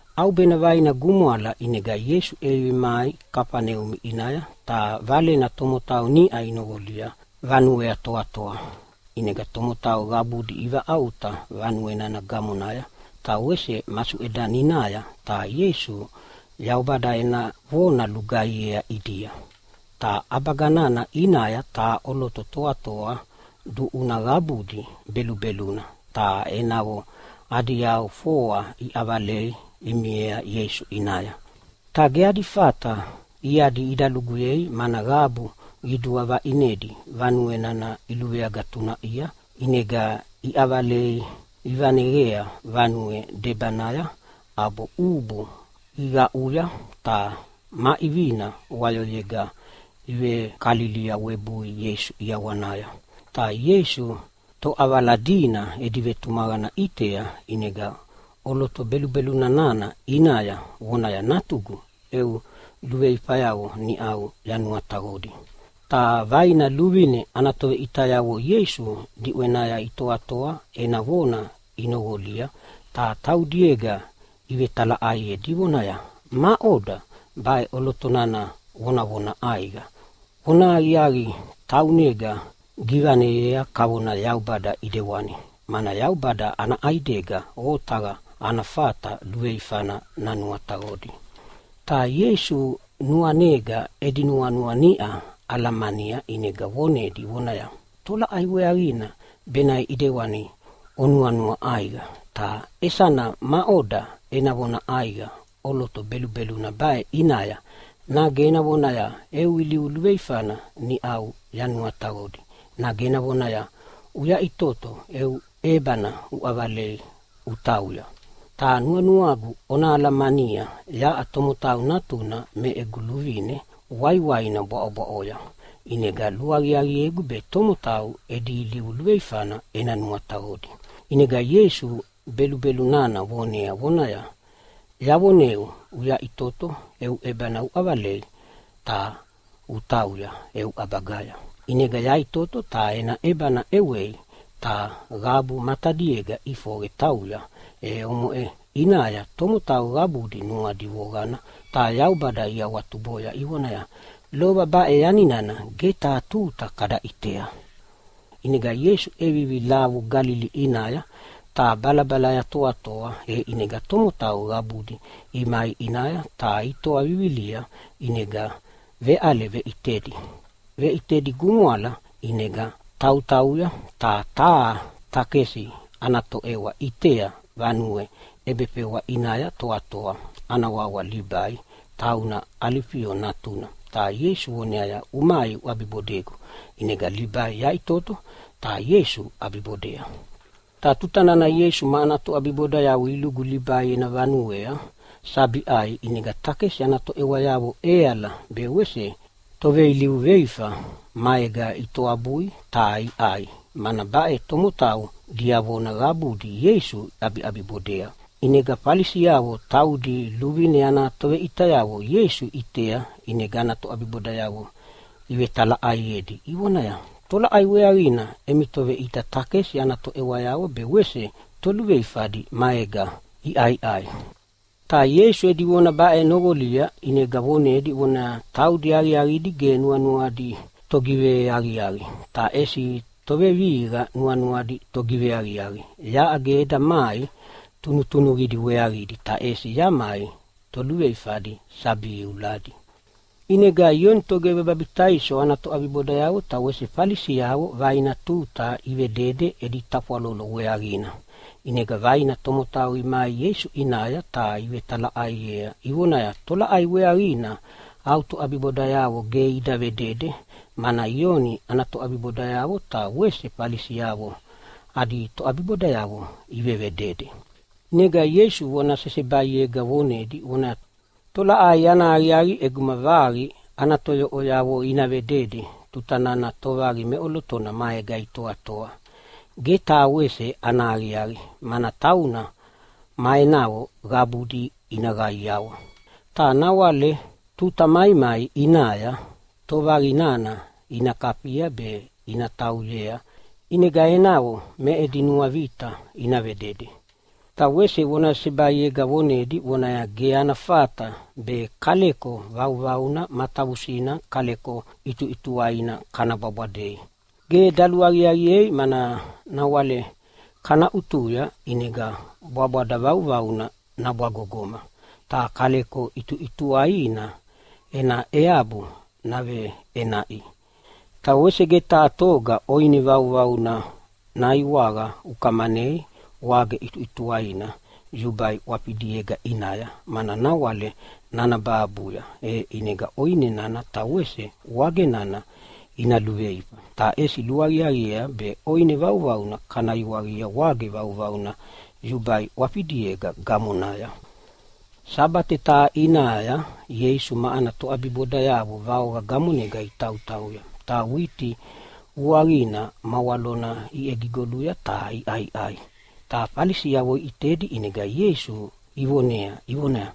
ʼAubena vaina gumwala ʼinega Ieisu ʼevivi mai Kafaneumi ʼinaya. Ta valena tomotau niʼa inoqolia vanuea toatoa. ʼInega tomotau qabudi ivaʼauta vanue nana gamonaya ta wese masuʼedaninaya, ta Ieisu Yaubada ena vona lugaihiea ʼidia. Ta ʼabaga nana ʼinaya taha ʼoloto toatoa duʼuna qabudi belubeluna, ta enavo adi yau foa iʼavalei imiea Ieisu ʼinaya. Ta ge adi fata iadi ida luguyei mana qabu qidua vaʼinedi vanue nana iluveagatunaʼia. ʼInega iʼavalei ivaneqea vanue debanaya ʼabo ʼubu iqaʼuya ta ma ʼivina wayoyega ivekalilia webui Ieisu ʼiawanaya. Ta Ieisu toʼavala dina edi vetumaqana ʼitea, ʼinega ʼoloto belubelu nana ʼinaya vonaya, “Natugu, eu luveifayavo niʼa yanuataqodi!” Ta vaina luvine ana toveʼitayavo Ieisu diʼwenaya itoatoa ena vona inoqolia ta taudiega ivetalaʼaiedi ivonaya, “Maʼoda baʼe ʼoloto nana vonavona ʼaiqa? Vonahaqiaqi, taunega givaneyea kavona Yaubada ʼidewani. Mana Yaubada ana ʼaidega otaqa ana fata luveifana nanuataqodi.” Ta Ieisu nuanega edi nuanua niʼa alamania ʼinega vonedi vonaya, “Tolaʼai weaqina benaʼe ʼidewani onuanua ʼaiqa? Ta isana maʼoda ena vona ʼaiqa ʼoloto belubeluna baʼe ʼinaya? Nage ena vonaya, ‘Eu ilivu luveifana niʼau yanuataqodi’, nage ena vonaya, ‘Uyaʼitoto, eu ʼebana uʼavala utauya?’ Ta nuanuagu ona alamania yaʼa Tomotau Natuna me egu luvine waiwaina bwaʼobwaʼoya, ʼinega luaqiaqiegu be tomotau edi ilivu luveifana ena nuataqodi.” ʼInega Ieisu belubelu nana vonea vonaya, “Yavoneu, uyaʼitoto eu ʼebana uʼavalei ta utauya eu ʼabagaya.” ʼInega yaʼitoto ta ena ʼebana ʼewei, ta qabu matadiega ʼifoqe tauya. E omoʼe ʼinaya tomotau qabudi nuadi voqana ta Yaubada iawatuboya ivonaya, “Lova baʼe yanina ge taha tuta kada ʼitea.” ʼInega Ieisu ʼevivi lavu Galili ʼinaya, ta balabalaya toatoa. E ʼinega tomotau qabudi imai ʼinaya ta itoa vivilia, ʼinega veʼale veʼitedi. Veʼitedi gumwala ʼinega tautauya, ta taha takesi ana toʼewa ʼitea vanue ʼebefewa ʼinaya toatoa. Ana wawa Libai, tauna Alifio natuna, ta Ieisu voneaya, “Umai uʼabibodegu!” ʼInega Libai yaʼitoto ta Ieisu ʼabibodea. Ta tuta nana Ieisu ma ana toʼabibodayavo ilugu Libai ena vanuea sabi ʼai, ʼinega takesi ana toʼewayavo ʼeala be wese toveilivu veifa maega itoabui ta iʼai, mana baʼe tomotau diavona qabudi Ieisu iʼabibodea. ʼInega Falisi taudi luvine ana toveʼitayavo Ieisu iʼitea, ʼinega ana toʼabibodayavo ivetalaʼaiedi ivonaya, “Tolaʼai weaqina emi toveʼita takesi ana toʼewayavo be wese toluveifadi maega iʼaiʼai?” Ta Ieisu edi vona baʼe noqolia ʼinega vonedi vonaya, “Taudi aqiaqidi ge nuanuadi togiveaqiaqi, ta ʼesi tovevihiqa nuanuadi togiveaqiaqi. Yaʼa ge eda mai tunutunuqidi weaqidi ta ʼesi yamai toluveifadi sabi iuladi.” Ioni Togivebabitaiso ana toʼabibodayavo ta wese Falisiavo vaina tuta ivedede edi tafwalolo weaqina. ʼInega vaina tomotau imai Ieisu ʼinaya ta ivetalaʼaiea ivonaya, “Tolaʼai weaqina oʼa au toʼabibodayavo ge ida vedede, mana Ioni ana toʼabibodayavo ta wese Falisiavo adi toʼabibodayavo ivevedede?” ʼInega Ieisu vona sesebaiega vonedi vonaya, “Tolaʼai ana aqiaqi ʼeguma vaqi ana toyoʼoyavo ina vedede tuta nana tovaqi meʼolotona maega itoatoa? Ge taha wese ana aqiaqi! Mana tauna ma enavo qabudi ina qaiawa. Ta nawale tuta maimai ʼinaya tovaqi nana ina kafia be ina tauyea, ʼinega enavo me edi nuavita ina vedede.” Ta wese vona sesebaiega vonedi vonaya, “Ge ana fata be kaleko vauvauna matavusinega kaleko ʼituʼituwaina kana bwabwadei. Ge daluaqiaqiea, mana nawale kana ʼutuya ʼinega bwabwada vauvauna nabwagogoma, ta kaleko ʼituʼituwainana ena eabu nagiveʼenaʼia. Ta wese ge taha toga ʼoine vauvauna naiwaqa ukamanei wage ʼituʼituwaina yubai ʼwafidiega ʼinaya, mana nawale nanabahabuya, e ʼinega ʼoine nana ta wese wage nana ina luveifa. Ta ʼesi luaqiaqiea be ʼoine vauvauna kana iwaqia wage vauvauna yubai ʼwafidiega gamonaya.” Sabate taha ʼinaya Ieisu ma ana toʼabibodayavo vaoqa gamonega itautauya ta witi vuaqina ma walona iʼegigoluya ta iʼaiʼai. Ta Falisi iʼitedi ʼinega Ieisu ivonea ivonaya,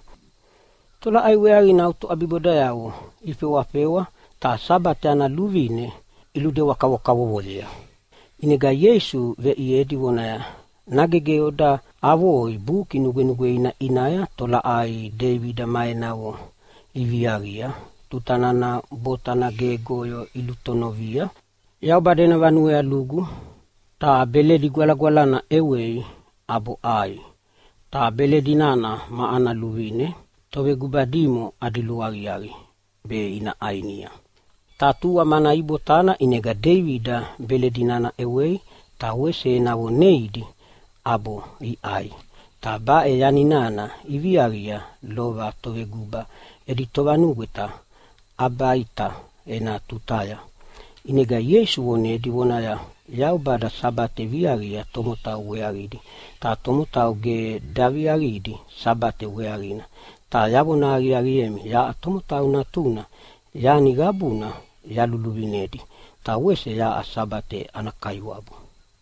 “Tolaʼai weaqina au toʼabibodayavo ifewafewa ta Sabate ana luvine iludewa kavokavovoyei?” ʼInega Ieisu veʼiedi vonaya, “Nage ge oda avoi Buki Nugwenugweina ʼinaya tolaʼai Deibida ma enavo iviaqia tuta nana botana gegoyo ilutonovia? Yaubada ena vanuea lugu ta beledi gwalagwalana ʼewei ʼabo ʼai. Ta beledi nana ma ana luvine toveguba dimo adi luaqiaqi be ina ʼainia. Ta tua mana ibotana, ʼinega Deibida beledi nana ʼewei ta wese enavo neidi ʼabo iʼai. Ta baʼe yani nana iviaqia lova toveguba edi tovanugweta Abiata ena tutaya.” ʼInega Ieisu vonedi vonaya, “Yaubada Sabate viaqia tomotau weaqidi, ta tomotau ge daviaqidi Sabate weaqina. Ta yavona aqiaqiemi, yaʼa Tomotau Natuna yani qabuna yaluviluvinedi, ta wese yaʼa Sabate ana Kaiwabu.”